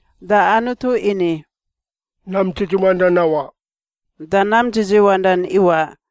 Da Anutu ini, “Nam dzidziwandan nawaꞌ,” da nam dzidziwandan iwaꞌ.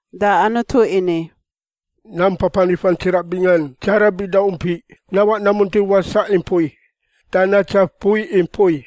Da Anutu ini, “Nam papanifan tsiraꞌ bingan dzara bida umpiꞌ nawaꞌ namunti wasaꞌ i mpui da natsaf mpui i mpui.”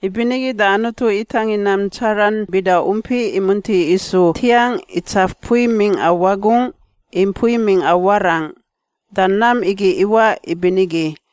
Ibinigi da Anutu itangin nam dzaran bida umpiꞌ imunti isu ntiangꞌ itsaf mpui mingꞌa wagungꞌ i mpui mingꞌa warangꞌ. Da nam igi iwaꞌ ibinigi.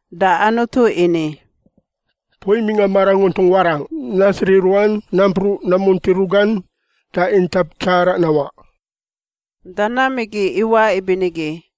Da Anutu ini, “Mpui mingꞌa maranguntung warangꞌ nasiri ruan nampruꞌ namunti rugan da intap tsaraꞌ nawaꞌ.” Da nam igi iwaꞌ ibinigi.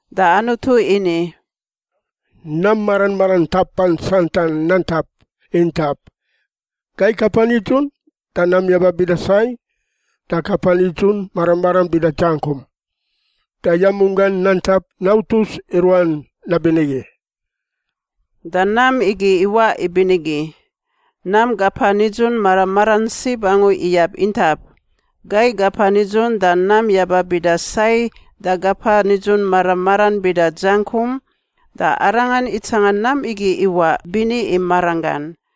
Da Anutu ini, “Nam mara maran ntapan santan nantap intap, gai kapa nidzun da nam yaba bida sai da kapa nidzun mara maran bida dzangkum. Da yamunggan nantap nautus i ruan nabinigi.” Da nam igi iwaꞌ ibinigi. Nam kapa nidzun mara maran sib angu iyab intap: gai kapa nidzun da nam yaba bida sai da kapa nidzun mara maran bida dzangkum. Da arangan itsanga nam igi iwaꞌ bini i maranggan.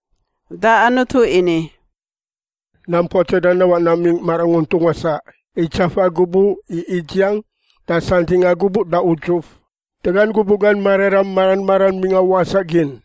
Da Anutu ini, “Nam puatsadan nawaꞌ namingꞌ maranguntung wasaꞌ i tsafa gubuꞌ i idziang da santingꞌa gubuꞌ da udzuf da gan gubuꞌ gan mararam mara maran mingꞌa wasaꞌ gin,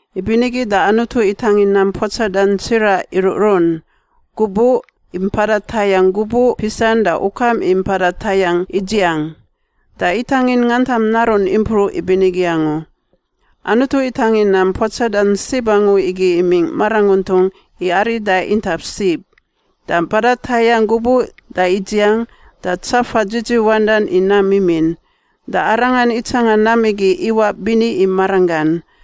Ibinigi da Anutu itangin nam puatsadan tsiraꞌ iruꞌrun, gubuꞌ i mpada tayangꞌ gubuꞌ pisan da ukam i mpada tayangꞌ idziang. Da itangin ngantam narun impruꞌ ibinigi angu. Anutu itangin nam puatsadan sib angu igi imingꞌ maranguntung i arida intap sib, da mpada tayangꞌ gubuꞌ da idziang, da tsafa dzidziwandan i nam mimin. Da arangan itsanga nam igi iwaꞌ bini i maranggan.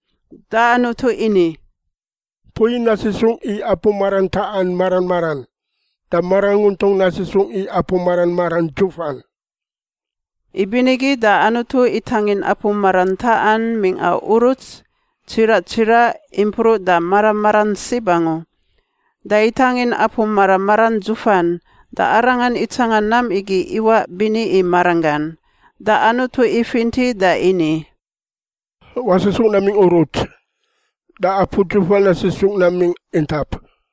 Da Anutu ini, “Mpui nasisungꞌ i apu marantaꞌan mara maran, da maranguntung nasisungꞌ i apu mara maran dzufan.” Ibinigi da Anutu itangin apu marantaꞌan mingꞌa uruts, tsiraꞌ tsiraꞌ impruꞌ da mara maran sib angu, da itangin apu mara maran dzufan. Da arangan itsanga nam igi iwaꞌ bini i maranggan. Da Anutu ifinti da ini, “Wasisungꞌ namingꞌ uruts da apu dzuf nasisungꞌ namingꞌ intap.”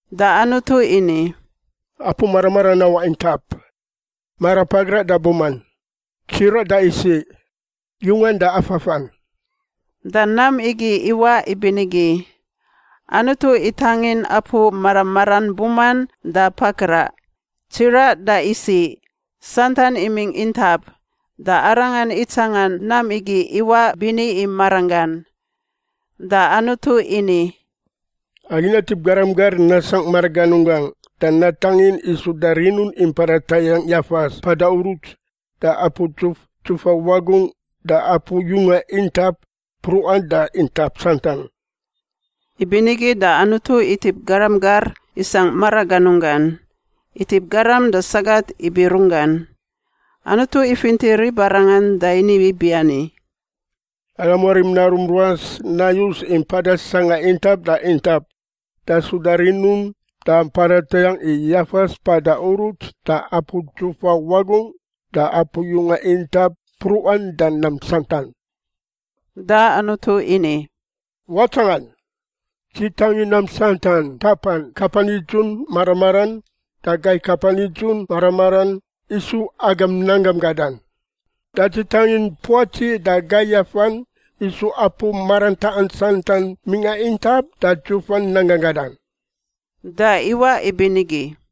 Da Anutu ini, “Apu mara maran nawaꞌ intap, marapagraꞌ da buman, tsiraꞌ da isiꞌ, yungan da afafan.” Da nam igi iwaꞌ ibinigi. Anutu itangin apu mara maran buman da pagraꞌ, tsiraꞌ da isiꞌ, santan imingꞌ intap. Da arangan itsanga nam igi iwaꞌ bini i maranggan. Da Anutu ini, “Agi natip garam gar nasangꞌ maraganunggangꞌ da natangin i suda rinun i mpada tayangꞌ yafas mpada uruts, da apu dzuf dzufa wagungꞌ, da apu yunga intap mpruꞌan da intap santan.” Ibinigi da Anutu itip garam gar isangꞌ maraganunggan. Itip garam da sagat ibi runggan. Anutu ifinti ribarangan da ini ibiani, “Agam warim narum ruas nayus i mpada sangꞌa intap da intap da suda rinun da mpada tayangꞌ i yafas mpada uruts da apu dzufa wagungꞌ da apu yunga intap mpruꞌan da nam santan.” Da Anutu ini, “Watsangan! Dzi tangin nam santan ntapan kapa nidzun mara maran da gai kapa nidzun mara maran isu agam nanggam gadan. Da dzi tangin puatsi da gai yafan isu apu marantaꞌan santan mingꞌa intap da dzufan nanggan gadan.” Da iwaꞌ ibinigi.